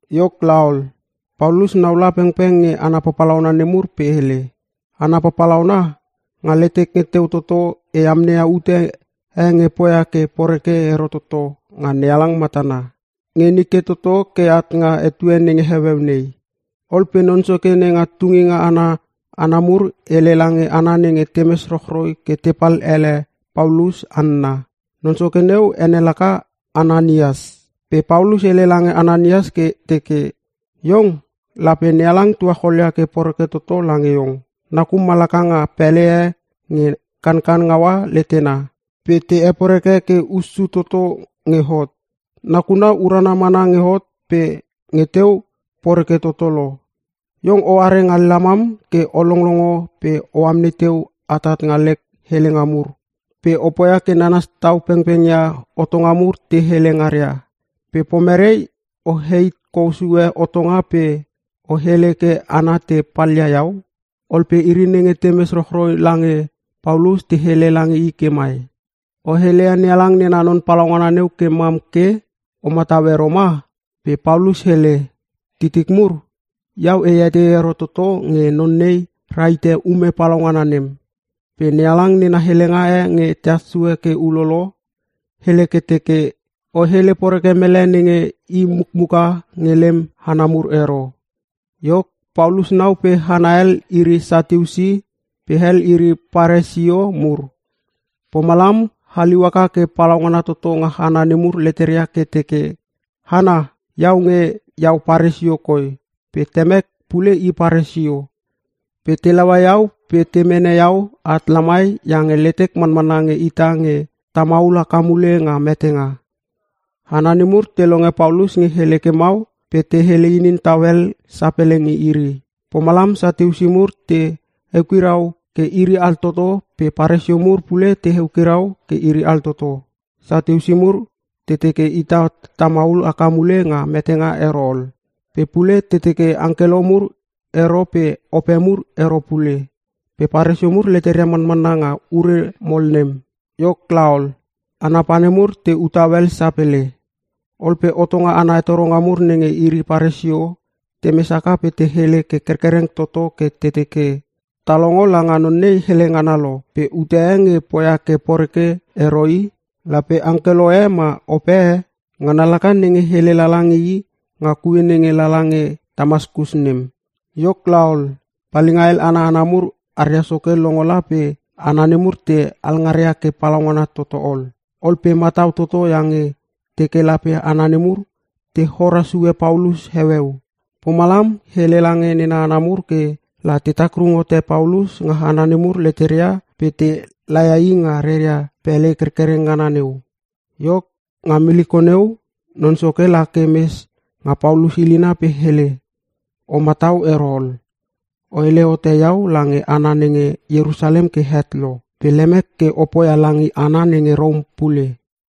Iok laol, Paulus nau la pengpeng nge hana papalauna nemur pe hele, “Hana papalauna, nga letek nge teu toto e amneia ute e nge e poia ke poreke ero toto nga NeHalang matana. Nge nike toto ke at nga etue nenge heueu nei.” Ol pe non soke nenga tunginga ana hana mur hele lange hana nenge temes rochroi ke tepal ele Paulus hanna. Non soke neu ene laka Ananias. Pe Paulus hele lange Ananias ke teke, “Iong, lape NeHalang tuacholia ke poreke toto lange iong. Nakum malaka nga pele e nge kankan ngaua letena pe te hepore ke hussu toto nge hot. Nakuna urana mana nge hot pe nge teu, poreke toto lo. Iong oare nga lamam ke o longlongo pe o amnei teu atat nga lek helenga mur, pe o poia ke nanas tau pengpeng ia hotonga mur te hele ngaria. Pe pomere o heit kou sue hotonga pe o hele ke hana te palia iau?” Ol pe iri nenge temes rochroi lange Paulus te hele lange i ke mai, “O heleia NeHalang nena non palaungana neu ke mam ke? O matau ero ma?” Pe Paulus hele, “Titik mur, iau e etei ero toto nge non nei rahite ume palaungana nem. Pe NeHalang nena helenga e nge tehas sue ke ulolo, hele ke teke, ‘O hele poreke mele nenge i mukmuka nge lem hana mur ero.’” Iok Paulus nau pe hana hel iri Satiusi, pe hel iri Paresio mur. Pomalam haliu haka ke palaungana toto nga hana nemur leteria ke teke, “Hana, iau nge iau Paresio koi pe temek pule i Paresio. Pe te laua iau pe te mene iau at lamai iange letek manmanna nge ita nge ta maul haka mule nga metenga.” Hana nemur te longe Paulus nge hele ke mau pe te hele inin tau hel sapele nge iri. Pomalam Satiusi mur te eukirau ke iri altoto pe Paresio mur pule te eukirau ke iri altoto. (Satiusi mur, te teke ita tamaul haka mule nga metenga ero ol. Pe pule te teke angkelo mur ero pe Ope mur ero pule. Pe Paresio mur leteria manmanna nga ure mol nem.) Iok laol, hana pane mur te u tau hel sapele. Ol pe hotonga ana hetoronga mur nenge iri Paresio, temes haka pe te hele ke kerkereng toto ke te teke, “Ta longo langa non nei hele ngana lo pe ute e nge poia ke poreke ero i! Lape angkelo e ma ope e. Ngana laka nenge hele lala nge i nga kue nenge lala nge Tamaskus nem.” Iok laol, palinga hel ana hana mur aria soke longo la pe hana nemur te alngaria ke palaungana toto ol. Ol pe matau toto iange teke lape hana nemur, te hora sue Paulus heueu. Pomalam hele lange nena hana mur ke la te takrung hote Paulus nga hana nemur leteria pe te laia i nga ria pele kerkereng ngana neu. Iok, nga miliko neu, Non Soke lake mes nga Paulus ilina pe hele, “O matau ero ol, o hele hote iau lange hana nenge Ierusalem ke het lo. Pe lemek ke o poia lange hana nenge Rom pule.”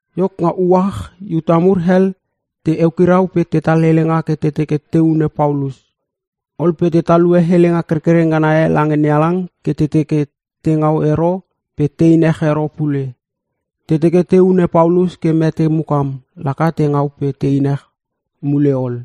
Iok nga uach Iuta mur hel te eukirau pe tetal helenga ke te teke te hune Paulus. Ol pe te talue helenga kerkereng ngana e lange NeHalang ke te teke te ngau ero pe tein ech ero pule. Te teke te hune Paulus ke mete mukam laka te ngau pe tein mule ech ol.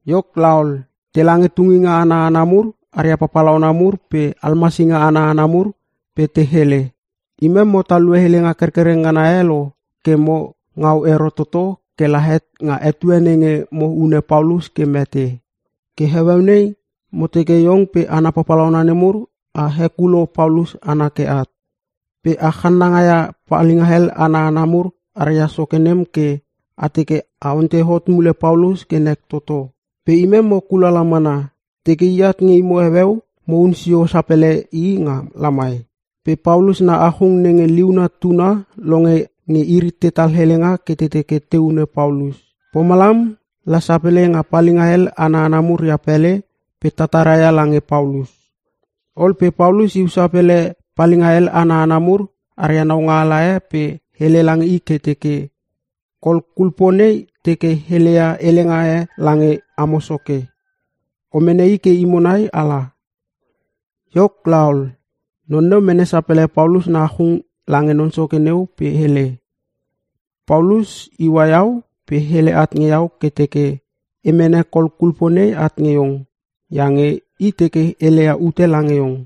Iok laol, tela nge tunginga ana hana mur aria papalauna mur pe almasinga ana hana mur pe te hele, “Imem mo talue helenga kerkereng ngana e lo ke mo ngau ero toto ke la het nga etue nenge mo hune Paulus ke mete. Ke heueu nei mo teke iong pe hana papalauna nemur a hekulo Paulus ana ke at. Pe a channanga ia palinga hel ana hana mur aria soke nem ke a teke a ontei hot mule Paulus ke nek toto. Pe imem mo kulala mana, teke iat nge imo heueu, mohun sio sapele i nga lamai.” Pe Paulus na achung nenge liuna tuna longe nge iri tetal helenga ke te hune Paulus. Pomalam, la sapele nga palinga hel ana hana mur ria pele pe tataraia lange Paulus. Ol pe Paulus iu sapele palinga hel ana hana mur aria naungaala e pe hele lange i ke teke, “Kol kulpo nei teke heleia helenga e lange amo soke. O mene i ke imo nai ala.” Iok laol, non neu mene sapele Paulus na achung lange non soke neu pe hele, “Paulus iua iau pe hele at nge iau ke teke e mene kol kulpo nei at nge iong, iange i teke heleia ute lange iong.”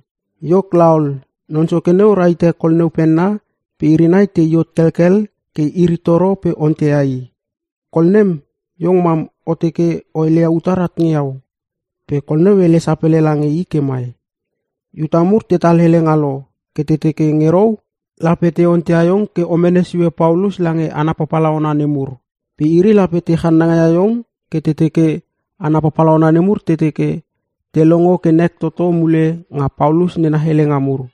Iok laol, non soke neu rahite kol neu penna pe iri nai te i hot kelkel ke iri toro pe onteia i, “Kol nem, iong mam o teke o heleia utar at nge iau?” Pe kol neu hele sapele lange i ke mai, “Iuta mur tetal helenga lo ke te teke nge rou, lape te onteia iong ke o mene sue Paulus lange hana papalauna nemur. Pe iri lape te channanga ia iong ke te teke hana papalauna nemur te teke te longo ke nek toto mule nga Paulus nena helenga mur.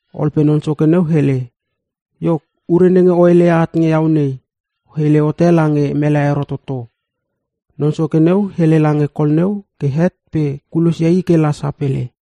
Ol pe non soke neu hele, “Iok ure nenge o heleia at nge iau nei, o hele hote lange mele ero toto.” Non soke neu hele lange kol neu ke het pe kulosia i ke la sapele.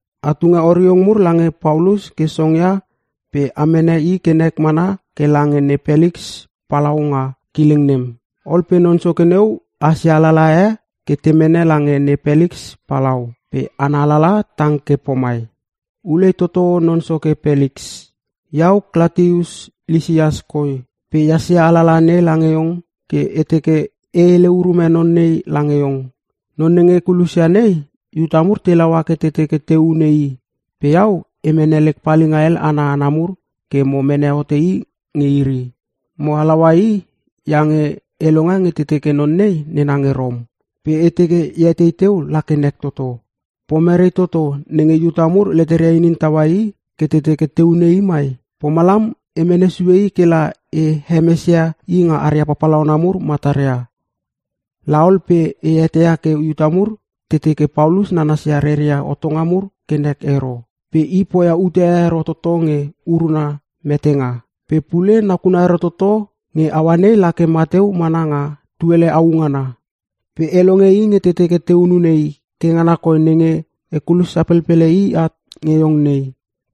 A tunge oriong mur lange Paulus ke songia pe a mene i ke nek mana ke lange ne Peliks palau nga kileng nem.” Ol pe non soke neu hasia alalaha e ke te mene lange ne Peliks palau. Pe ana alalaha tang ke pomai, “Ulei toto Non Soke Peliks, Iau Klatius Lisias koi, pe ehas ia alalaha nei lange iong ke e teke e hele urume non nei lange iong. Non nenge e kulosia nei, Iuta mur te laua ke te teke te hune i pe iau e mene lek palinga hel ana hana mur ke mo mene hote i nge iri. Mo halaua i iange e longe nge te teke non nei nena nge Rom. Pe e teke e etei teu la ke nek toto. Pomere toto nenge Iuta mur leteria inin taua i ke te teke te hune i mai? Pomalam e mene sue i ke la e hemesia i nga aria papalauna mur mataria. Laol pe e eteia ke Iuta mur te teke Paulus nanasia reria hotonga mur ke nek ero. Pe i poia ute e ero toto nge uruna metenga. Pe pule nakuna urana ero toto nge aua nei lake mateu mana nga tuele au ngana. Pe e longe nge te teke te hunune i ke ngana koi nenge e kulos sapelpele i at nge iong nei.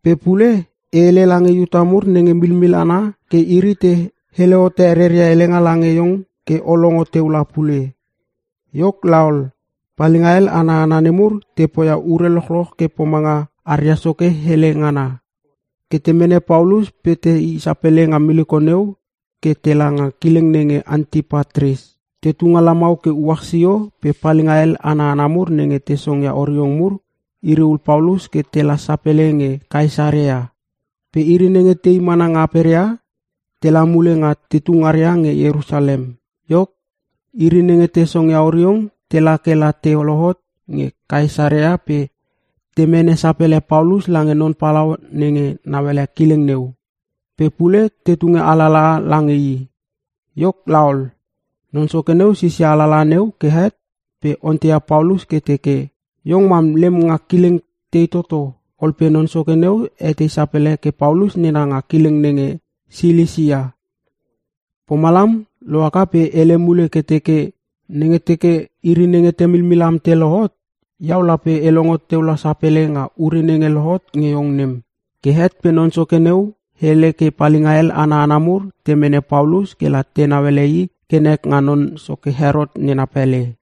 Pe pule e hele lange Iuta mur nenge milmil ana ke iri te hele hote reria helenga lange iong ke o longo teu la pule.” Iok laol, palinga hel ana hana nemur te poia ure lochloch ke pomanga aria soke hele ngana. Ke te mene Paulus pe te i sapele nga miliko neu ke tela nga kileng nenge Antipatris. Te tu nga lamau ke uach sio pe palinga hel ana hana mur nenge te songia oriong mur, iri ul Paulus ke tela sapele nge Kaesarea. Pe iri nenge te i mana nga aperia, tela mule nga tetu ngaria nge Ierusalem. Iok iri nenge te songia oriong tela ke la te lohot nge Kaesarea pe te mene sapele Paulus lange non palau nenge nauele kileng neu. Pe pule te tunge alalaha lange i. Iok laol, non soke neu sisia alalaha neu ke het pe onteia Paulus ke teke, “Iong mam lem nga kileng tei toto?” Ol pe non soke neu etei sapele ke Paulus nena nga kileng nenge Silisia. Pomalam lohaka pe hele mule ke teke, “Nenge teke iri nenge te milmil am te lohot, iau lape e longo teu la sapele nga ure nenge lohot nge iong nem.” Ke het pe non soke neu hele ke palinga hel ana hana mur te mene Paulus kela tenau ele i ke nek nga non soke Herot nena pele.